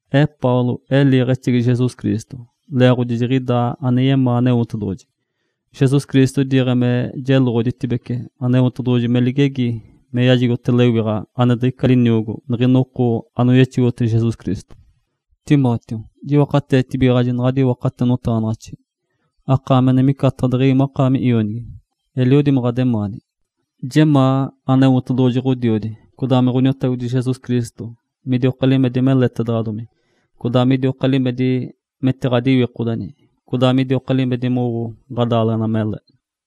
Ee Paulo, ee liiɡ̶exegi Jesus Cristo, leeɡ̶odi jiɡ̶idaa ane yemaa Aneotedoɡ̶oji. Jesus Cristo idiiɡ̶e me jeloɡ̶oditibece Aneotedoɡ̶oji me ligegi me yajigote lewiɡ̶a ane diɡ̶ica liniogo niɡ̶ina oko anoyexogotege Jesus Cristo. Timóteo, jiwakateetibigaɡ̶aji naɡ̶adi iwakate notaɡ̶anaɡ̶axi, akaami ane micataɡ̶a deɡ̶ewi makaami ionigi, eliodi me ɡ̶ademaani. Jemaa Aneotedoɡ̶oji Ǥodiodi, codaa me Ǥoniotagodi Jesus Cristo midioka limedi meletaɡ̶adomi, codaa midioka limedi metiɡ̶adiwikodeni, codaa midioka limedi mowo ɡ̶adaaleɡ̶ena mele.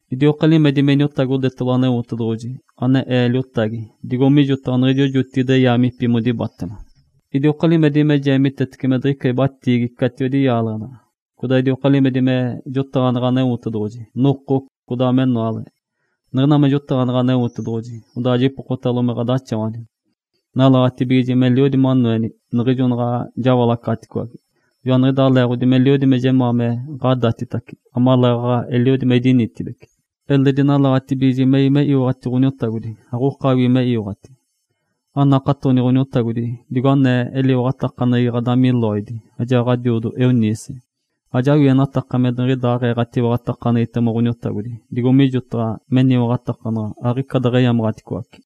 Idioka limedi me iniotagodetalo Aneotedoɡ̶oji, ane ee liotagi digo mijotaɡ̶a niɡ̶ijo jotigide yaamipi modibatema, idioka limedi me jeemitetece me diɡ̶ica ibatiigi catiwedi yaaleɡ̶ena. Codaa idioka limedi me jotaɡ̶aneɡ̶e Aneotedoɡ̶oji noko, codaa menoale. Niɡ̶ina me jotaɡ̶aneɡ̶e Aneotedoɡ̶oji, odaa jipokotalo me ɡ̶adaxawani. Nalaɡ̶atibigiji meliodi manoenitibece niɡ̶ijo naɡ̶a jawalacaɡ̶atiwage. Joaniɡ̶idaa leeɡ̶odi meliodi me jemaa me ɡ̶adatitace, amaleeɡ̶aɡ̶a eliodi me idinitibeci. Eledi nalaɡ̶atibigiji mewi me iwaɡ̶ati Ǥoniotagodi, aɡ̶okawii me iwaɡ̶ati. Anakatoni Ǥoniotagodi digo anee eliwaɡ̶atakaneɡ̶egi ɡ̶adami Lóide, ajaa ɡ̶adiodo Eunice. Ajawienataka me niɡ̶idaaɡ̶ee ɡ̶atiwaɡ̶atakaneɡ̶egitema Ǥoniotagodi, digo mijotaɡ̶a meniwaɡ̶atakanaɡ̶a aɡ̶ica deɡ̶eyamaɡ̶aticoace.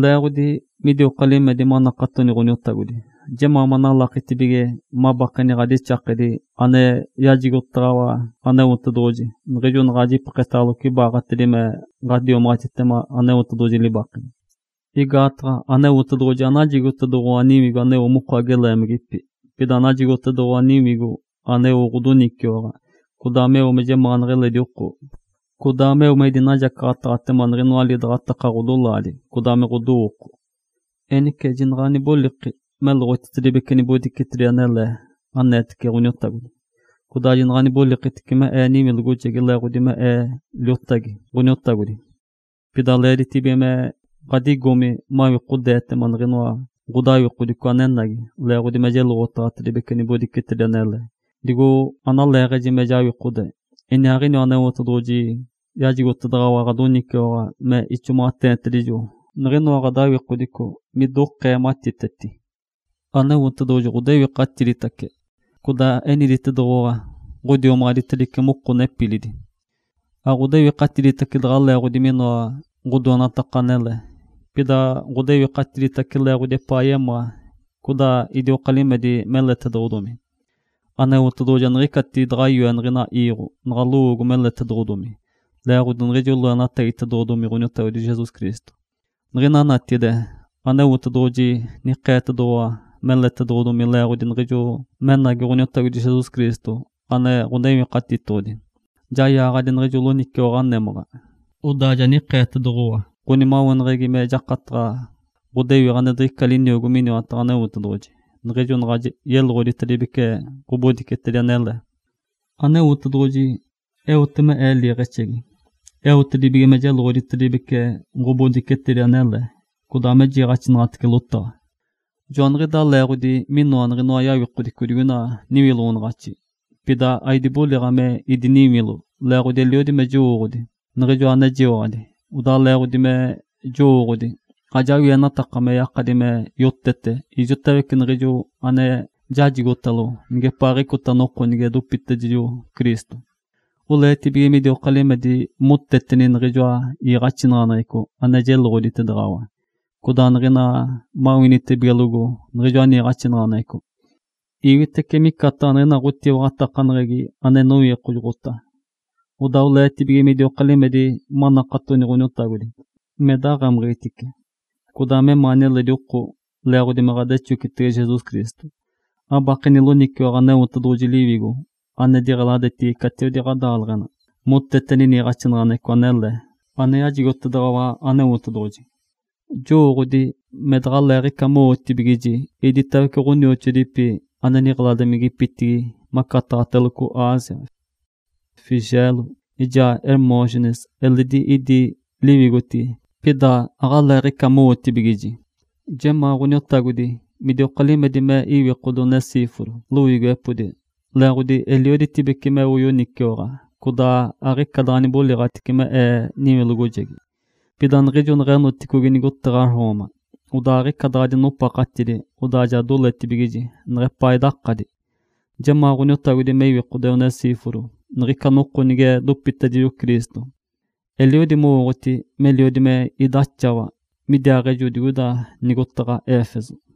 Leeɡ̶odi midioka limedi manakatoni Ǥoniotagodi, jemaa manalakitibige mabakeni ɡ̶adixakedi ane yajigotedaɡ̶awa Aneotedoɡ̶oji niɡ̶ijo naɡ̶a jipeketaɡ̶aloco ibaaɡ̶atedi me ɡ̶adiomaɡ̶atitema Aneotedoɡ̶oji libakedi. Igaataɡ̶a Aneotedoɡ̶oji anajigotedoɡ̶owa niwigo aneo moko ageleemagipi, pida najigotedoɡ̶owa Liwigo aneo ɡ̶odoniciwaɡ̶a, codaa meo me jemaanaɡ̶a eledi oko, codaa meo me idinajacaɡ̶ataɡ̶atema niɡ̶inoa lidaɡ̶ataka ɡ̶odolaadi codaa me ɡ̶odowooko. Enice jinaɡ̶a aniboliki meloɡ̶otitedibece nibodicetedi anele aneetece Ǥoniotagodi, codaa jinaɡ̶a anibolikitici me ee niwilogojegi leeɡ̶odi me ee liotagi Ǥoniotagodi. Pida leeditibige me ɡ̶adigomi mawikodeetema niɡ̶inoa ɡ̶odawikodico anenagi leeɡ̶odi me jeloɡ̶otaɡ̶atedibece ɡ̶obodicetedi anele, digo analeeɡ̶eji me jawikode. Iniaaɡ̶iniwa Aneotedoɡ̶oji yajigotedaɡ̶awa ɡ̶adoniciwaɡ̶a me ixomaɡ̶ateenitedijo niɡ̶inoa ɡ̶adawikodico midokee matiteti. Aneotedoɡ̶oji ɡ̶odewikatiditace, codaa eniditedoɡ̶owa ɡ̶odiomaɡ̶aditedice moko nepilidi. Aɡ̶odewikatiditace daɡ̶a leeɡ̶odi minoa ɡ̶odoenataka anele, pida ɡ̶odewikatiditace leeɡ̶odi epaa yemaa, codaa idioka limedi meletedoɡ̶odomi. Aneotedoɡ̶oji aniɡ̶ica daɡ̶a yoe niɡ̶ina iiɡ̶o naɡ̶a lowoogo meletedoɡ̶odomi leeɡ̶odi niɡ̶ijo loenatagitedoɡ̶odomi Jesus Cristo. Niɡ̶ina natigide, Aneotedoɡ̶oji ja nikeetedoɡ̶owa meletedoɡ̶odomi leeɡ̶odi niɡ̶ijo menagi Ǥoniotagodi Jesus Cristo ane Ǥonewikatitoɡ̶odi. Ja yaaɡ̶adi niɡ̶ijo loniciwaɡ̶a némaɡ̶a, odaa ja nikeetedoɡ̶owa ɡ̶onimaweneɡ̶egi me jakataɡ̶a ɡ̶odewiɡ̶a ane diɡ̶ica liniogo miniwataɡ̶a Aneotedoɡ̶oji, niɡ̶ijo naɡ̶a yeloɡ̶oditedibece ɡ̶obodicetedi anele. Aneotedoɡ̶oji eote me ee liiɡ̶exegi, eotedibige me jeloɡ̶oditedibece ɡ̶obodicetedi anele, codaa me jiiɡ̶axinaɡ̶atece lotaɡ̶a. Joaniɡ̶idaa leeɡ̶odi minoa niɡ̶inoa yawikodico digoina niwiloɡ̶onaɡ̶axi, pida aidiboliɡ̶a me idiniwilo. Leeɡ̶odi eliodi me jowooɡ̶odi Niɡ̶ijoa anejiwaɡ̶adi, odaa leeɡ̶odi me jowooɡ̶odi, ajawienataka me yakadi me yotete ijotawece niɡ̶ijo ane jajigotalo nigepaaɡ̶icota noko nige dopitedijo Cristo. Oleetibige midioka limedi moteteni niɡ̶ijoa iiɡ̶axinaɡ̶aneɡ̶eco ane jeloɡ̶oditedaɡ̶awa, codaa niɡ̶ina mawinitibigelogo niɡ̶ijoa niiɡ̶axinaɡ̶aneɡ̶eco, iwitece micataɡ̶a niɡ̶ina ɡ̶owinigijegi ane inowikojoɡ̶ota. Odaa oleetibige midioka limedi manakatoni Ǥoniotagodi, me daɡ̶amiɡ̶itice, codaa memaani eledi oko leeɡ̶odi me ɡ̶adexocitege Jesus Cristo. Abakeni loniciwaɡ̶a Aneotedoɡ̶oji Liwigo ane diɡ̶eladetigi catiwedi ɡ̶adaaleɡ̶ena moteteni niiɡ̶axinaɡ̶aneɡ̶eco anele ane yajigotedaɡ̶awa Aneotedoɡ̶oji. Joɡ̶owooɡ̶oti me daɡ̶aleeɡ̶ica mowootibigiji iditawece ɡ̶onioxoadipi ane niɡ̶eladimigipitigi macataɡ̶ateloco Ásia. Fígelo ijaa Hermógenes eledi idi liwigotigi pida aɡ̶aleeɡ̶aɡ̶ica mowotibigiji. Jemaa Ǥoniotagodi midioka limedi me iwikode Onesíforo loiigiwepodi, leeɡ̶odi elioditibece meo yoniciwaɡ̶a, codaa aɡ̶ica daɡ̶a niboliɡ̶atici me ee niwilogojegi. Pida niɡ̶ijo neɡ̶enoticogi nigotaɡ̶a Roma, odaa aɡ̶ica daɡ̶a dinopaɡ̶adi, odaa ja doletibigiji neɡ̶epaa idakadi. Jemaa Ǥoniotagodi me iwikode Onesíforo niɡ̶ica noko nige dopitedijo Cristo. Eliodi mowooɡ̶oti meliodi me idaxawa midiaaɡ̶ejo digoida nigotaɡ̶a Éfeso.